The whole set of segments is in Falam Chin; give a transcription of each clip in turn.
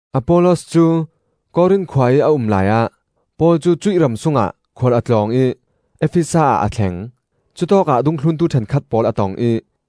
Apollos cu Korin khua ih a um laiah Paul cu cuih ram sungah khual a tlawng ih Efesa ah a thleng. Cutawkah dungthluntu ṭhenkhat pawl a tong ih,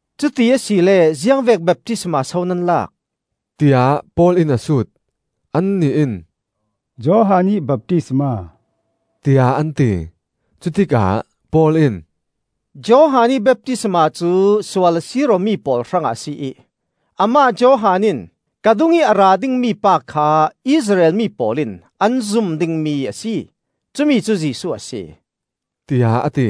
“Cuti asile ziangvek baptisma so nan lak?” tiah Paul in a sut. Annih in, “Johan ih baptisma,” tiah an ti. Cutikah Paul in, “Johan ih baptisma cu sual a sir awmi pawl hrangah a si ih amah Johan in ka dungih a ra ding pa kha Israel mi pawl in an zum dingmi a si. Cumi cu Jesuh a si,” tiah a ti.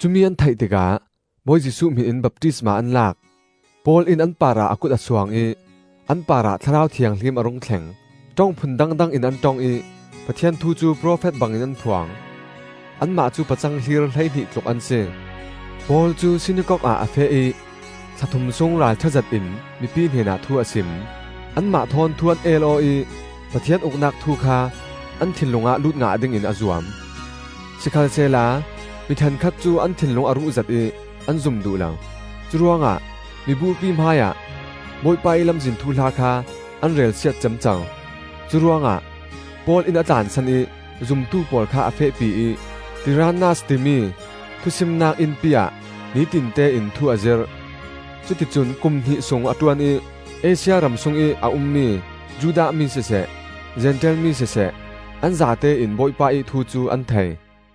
Cumi an theih tikah Bawi Jesuh hmin in baptisma an lak. Paul in an parah a kut a suang ih an parah Thlarau Thianghlim a rung thleng; ṭong phun dangdang in an ṭong ih Pathian thu cu profet bangin an phuang. Anmah cu pacang hlir hleihnih tluk an si. Paul cu sinakok ah a feh ih thla thum sung ralṭha zetin mipi hnenah thu a sim. Anmah thawn thu an el aw ih Pathian Uknak thu kha an thinlung ah lut ngah dingin a zuam. Sikhalsehla mi ṭhenkhat cu an thinlung a ruhzet ih an zum duh lo; curuangah miburpi hmaiah Bawipa ih Lamzin thuhla kha an relsiat ciamco. Curuangah Paul in a tlansan ih zumtu pawl kha a fehpi ih Tirannas timi thusimnak innpi ah nitinte in thu a zirh. Cuti cun kum hnih sung a ṭuan ih Asia ram sungih a ummi Judah mi siseh, Zentail mi siseh, an zatein Bawipa ih thu cu an thei.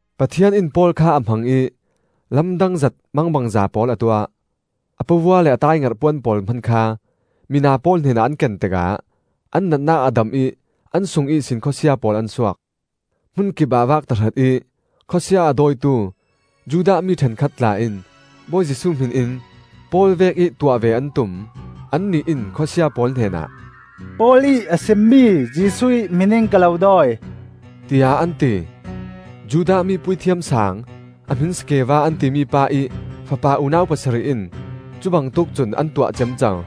Pathian in Paul kha a hmang ih lamdang zet, mangbangza pawl a tuah. A pavua le a taaingerh puan pawl hman kha mina pawl hnenah an ken tikah an natnak a dam ih an sung ihsin khuasia pawl an suak. Hmunkipah vak tahratih khuasia a dawitu Judah mi ṭhenkhat tla in Bawi Jesuh hmin in Paul vekih tuah ve an tum. Annih in khuasia pawl hnenah, “Paul ih a simmi Jesuh ih hmin in ka lo dawi,” tiah an ti. Judah mi Puithiam Saang a hmin Skeva an timi pa ih fapa unau pasarih in cubangtuk cun an tuah ciamco.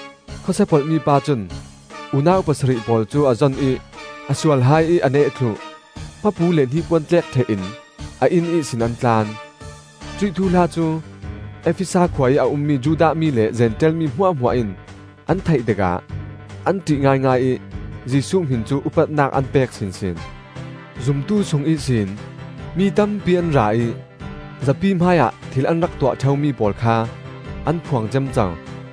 Khuasia polhmi pa cun unau pasarih pawl cu a zon ih a sual hai ih a neh thluh. Hmapu le hnipuan tlek ṭheh-in a inn ihsin an tlan. Cuih thuhla cu Efesa khua ih a ummi Judah mi le Zentail mi hmuahhmuah in an theih tikah an ṭih ngaingai ih Jesuh hmin cu upatnak an pek sinsin. Zumtu sung ihsin mi tampi an ra ih zapi hmaiah thil an rak tuah ṭheumi pawl kha an phuang ciamco.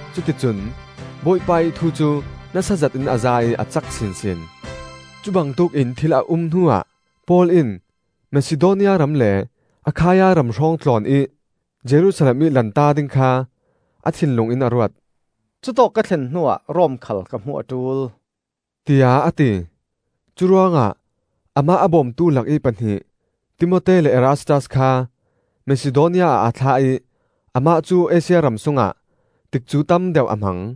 Cuti cun Bawipa ih thu cu nasa zetin a zai ih a cak sinsin. Cubangtuk in thil a um hnuah Paul in Masidonia ram le Akhaia ram hrawng tlawn ih Jerusalem ih lanta ding kha a thinlung in a ruat. “Cutawk ka thlen hnuah Rom khal ka hmuh a ṭul,” tiah a ti. Curuangah amah a bawmtu lakih pahnih Timote le Erastas kha Masidonia ah a thlah ih amah cu Asia ram sungah tikcu tam deuh a hmang.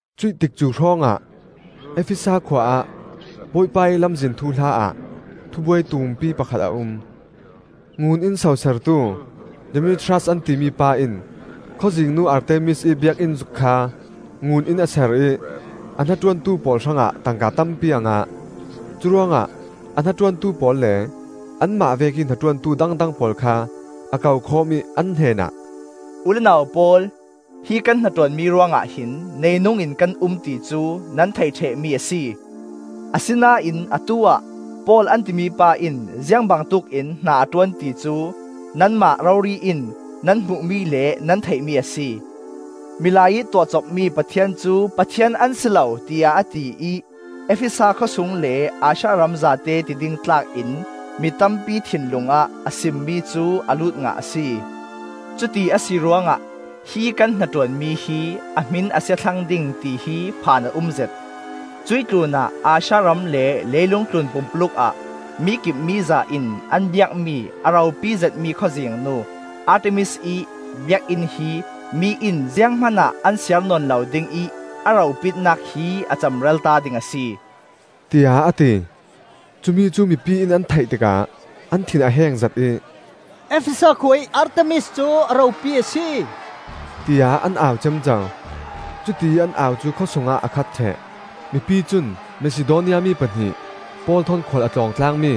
Cuih tikcu hrawngah Efesa khua ah Bawipa ih Lamzin thuhla ah thubuai tumpi pakhat a um. Ngun in sosertu Demetrias an timi pa in khawzingnu Artemis ih biakinn zuk kha ngun in a ser ih a hnaṭuantu pawl hrangah tangka tampi a ngah. Curuangah a hnaṭuantu pawl le anmah vekih hnaṭuantu dangdang pawl kha a kokhawm ih an hnenah, “U le nau pawl, hi kan hnaṭuanmi ruangah hin neinungin kan um ti cu nan theih ṭhehmi a si. Asinain atu-ah Paul an timi pa in ziang bangtuk in hna a ṭuan ti cu nanmah rori-in nan hmuhmi le nan theihmi a si. ‘Milai ih tuahcopmi pathian cu pathian an si lo,’ tiah a ti ih Efesa khawsung le Asia ram zate ti ding tlak in mi tampi thinlung ah a simmi cu a lut ngah a si. Cuti a si ruangah hi kan hnaṭuanmi hi a hmin a sia thlang ding tihi phan a umzet. Cuih tlunah Asia ram le leilung tlun pumpuluk ah mikip miza in an biakmi a ropi zetmi khawzingnu Artemis ih biakinn hi mi in zianghman ah an siar nawn lo ding ih a ropitnak hi a cemralta ding a si,” tiah a ti. Cumi cu mipi in an theih tikah an thin a hengzet ih, “Efesa khua ih Artemis cu a ropi a si,” tiah an au ciamco. Cutiih an au cu khawsungah a khat ṭheh. Mipi cun, Masidonia mi pahnih Paul thawn khual a tlawng tlangmi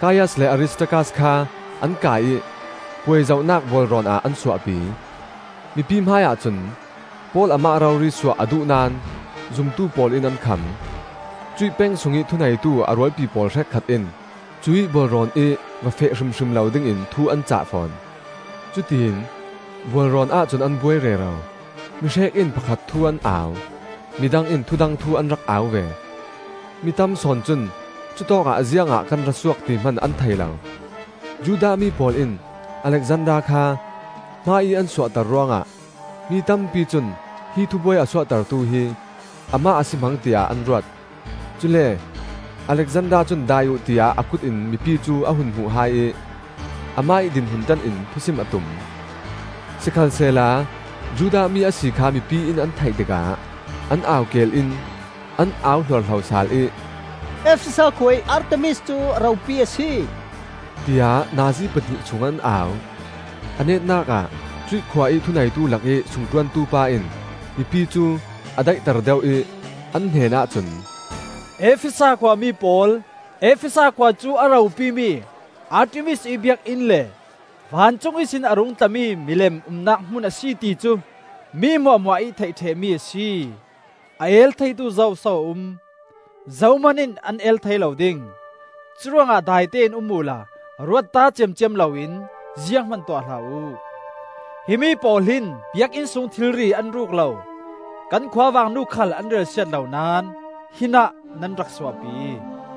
Kaias le Aristarkas kha an kai ih puai zohnak bualrawn ah an suahpi. Mipi hmaiah cun Paul amah rori suah a duh naón zumtu pawl in an kham. Cuih peng sungih thuneitu a rualpi pawl hrekkhat in cuih bualrawn ih va feh hrimhrim lo dingin thu an cah fawn. Cutiin bualrawn ahcun an buai rero; mihrek in pakhat thu an au, midang in thudang thu an rak au ve; mi tam sawn cun cutawkah ziangah kan ra suak ti hman an thei lo. Judah mi pawl in Alexander kha hmaiih an suahter ruangah mi tampi cun hi thubuai a suahtertu hi amah a si hmang tiah an ruat. Cule Alexander cun dai uh, tiah a kut in mipi cu a hun hmuh hai ih amah ih dinhmun ṭan in thusim a tum. Sikhalsehla Judah mi a si kha mipi in an theih tikah an au keel in an au hluarhlo sal ih, “Efesa khua ih Artemis cu a ropi a si,” tiah nazi pahnih sung an au. A netnak ah cuih khua ih thuneitu lakih sungṭuantu pa in mipi cu a daihter deuh ih an hnenah cun, “Efesa khuami pawl, Efesa khua cu a ropimi Artemis ih biakinn le vancung ihsin a rung tlami milem umnak hmun a si ti cu mi hmuahhmuahih theih ṭhehmi a si. A el theitu zoso a um? Zohman in an el thei lo ding. Curuangah daitein um uhla ruatta ciamciam loin zianghman tuah hlah uh. Himi pawl hin biakinn sung thilri an ruk lo, kan khuavangnu khal an relsiat lo naón hinah nan rak suahpi.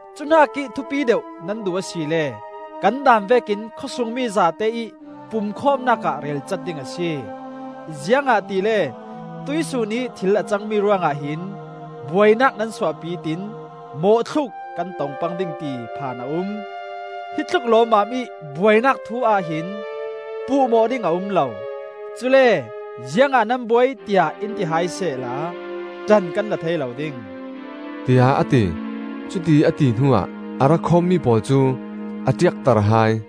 Cuhnakih thupi deuh nan duh asile kan daan vekin khawsungmi zate ih pumkhawmnak ah relcat ding a si. Ziangahtile tuihsun ih thil a cangmi ruangah hin buainak nan suahpi tiin mawhthluk kan tong pang ding ti phan a um. Hi tluk lawmmam ih buainak thu-ah hin puhmawh ding a um lo; cule ziangah nan buai tiah in ti hai sehla ṭan kan la thei lo ding,” tiah a ti. Cutiih a ti hnuah a ra khawmmi pawl cu a ṭiakter hai.